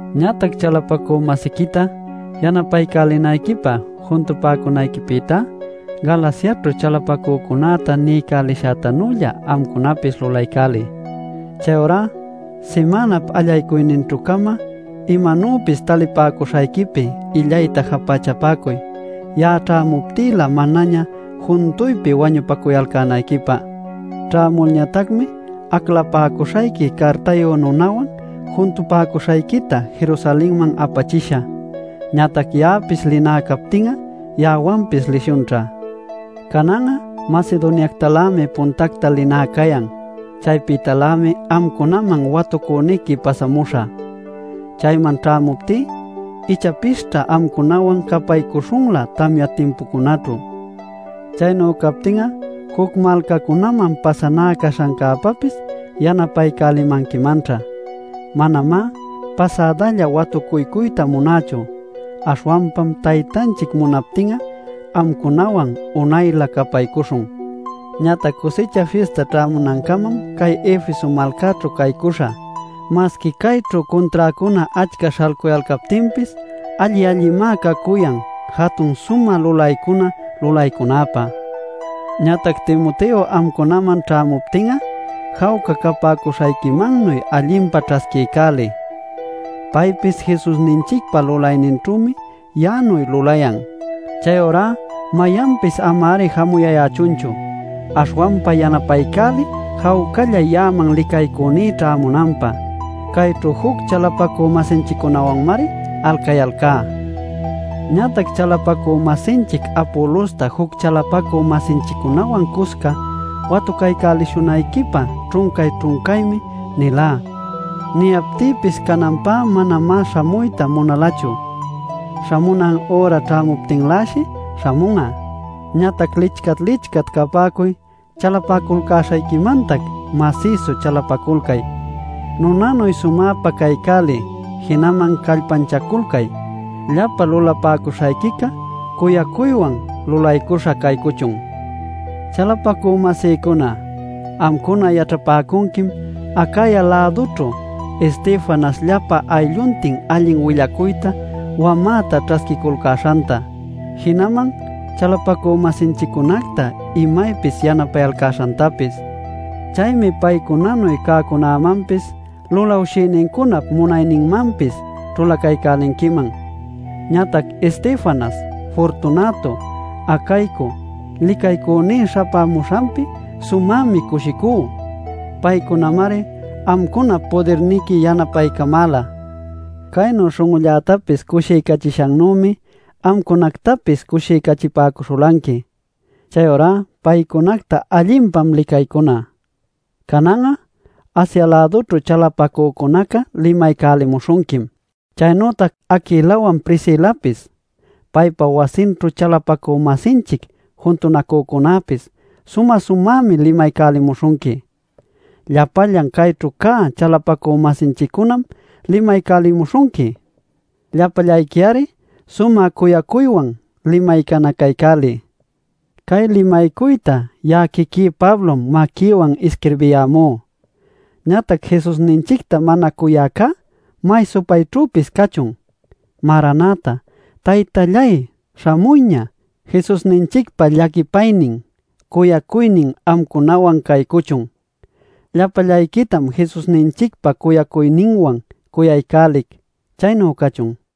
Ñatac chalapacü-masiquita yanapaycälinayquipä juntupäcunayquipïtá, Galaciaćhu chalapacücunäta niycälishäcätanuylla amcunapis lulaycäliy. Chayurá simänap allaycuyninćhü-cama imanuypis talipäcuśhayquipi illayta japächapäcuy ya'a ćhämuptïlä manaña juntuypi wañupacuyalcänayquipä. Ćhämulñatacmi aclapäcuśhayqui cartayu nunawan juntupäcuśhayquita Jerusalenman apachishä. Ñatac ya'apis linä captin'a ya'awanpis lishunćha. Canan'a Macedoniactalämi puntacta linä cayan. Chaypïtalämi amcunaman watucüniqui pasamuśhä. Chayman ćhämuptí ichapisćha amcunawan capaycuśhunlä tamya timpucunäćhu. Chaynu captin'a juc malcacunaman pasanä caśhancäpäpis yanapaycälimanquimanćha. Manamá pasädalla watucuycuyta munächu, aśhwanpam Taytanchic munaptin'a amcunawan unaylä capaycuśhun. Ñatac Cusicha Fista ćhämunancamam cay Efeso malcäćhu caycuśhä. Masqui cayćhu cunträcuna achca śhalcuyalcaptinpis alli-allinmá cacuyan jatun sumä lulaycunacta lulaycunäpä. Ñatac Timoteo amcunaman ćhämuptin'a jawca capäcuśhayquimannuy allinpa ćhasquiycäliy. Paypis Jesusninchicpa lulayninćhümi ya'anuy lulayan. Chayurá mayanpis ama-ari jamuyayächunchu, aśhwanpa yanapaycäliy jawcalla ya'aman licaycüní ćhaycamunanpä. Cayćhu juc chalapacü-masinchiccunawanmari alcayalcá. Ñatac chalapacü-masinchic Apolosta juc chalapacü-masinchiccunawan cusca watucaycälishunayquipä ćhuncay-ćhuncaymi nilá. Niyaptïpis cananpä manamá śhamuyta munalachu; śhamunan üra ćhämuptinläshi śhamun'a. Ñatac lichcat-lichcat capäcuy, chalapaculcäśhayquimantac masïsu chalapaculcay, nunanuy sumäpa caycäliy, jinaman callpanchaculcay. Llapa lulapäcuśhayquica cuyacuywan lulaycuśha caycuchun. Chalapacü-masïcuna, amcuna yaćhapäcunquim Acaya-lädućhu Estefanas llapa aylluntin allin willacuyta wamäta ćhasquiculcäśhanta, jinaman chalapacü-masinchiccunacta imaypis yanapayalcäśhantapis. Chaymi paycunanuy cäcunämanpis, lulawshïnincunap munayninmanpis ćhulaculcanquiman. Ñatac Estefanas, Fortunato, Acaico licaycüní śhapämuśhanpi sumämi cushicú. Paycunamari amcunap pudirniqui yanapaycamäla. Caynu śhun'ullätapis cushiycachishannümi amcunapactapis cushiycachipäcuśhulanqui. Chayurá paycunacta allinpam licaycuna. Canan'a, Asia-lädućhu chalapacücunaca limaycälimuśhunquim. Chaynütac Aquilawan Priscilapis, paypa wasinćhu chalapacü-masinchic juntunacücunäpis sumä-sumämi limaycälimuśhunqui. Llapallan cayćhu cä chalapacü-masinchiccunam limaycälimuśhunqui. Llapallayqui-ari sumä cuyacuywan limaycanacaycäliy. Cay limaycuyta ya'a quiquí Pablom maquïwan isquirbiyämú. Ñatac Jesusninchicta mana cuyäcunacá ¡may supayćhüpis cachun! Maranata - ¡Taytalláy, śhamuyña! Jesusninchicpa llaquipaynin, cuyacuynin amcunawan caycuchun. Llapallayquitam Jesusninchicpa cuyacuyninwan cuyaycälic. Chaynu cachun.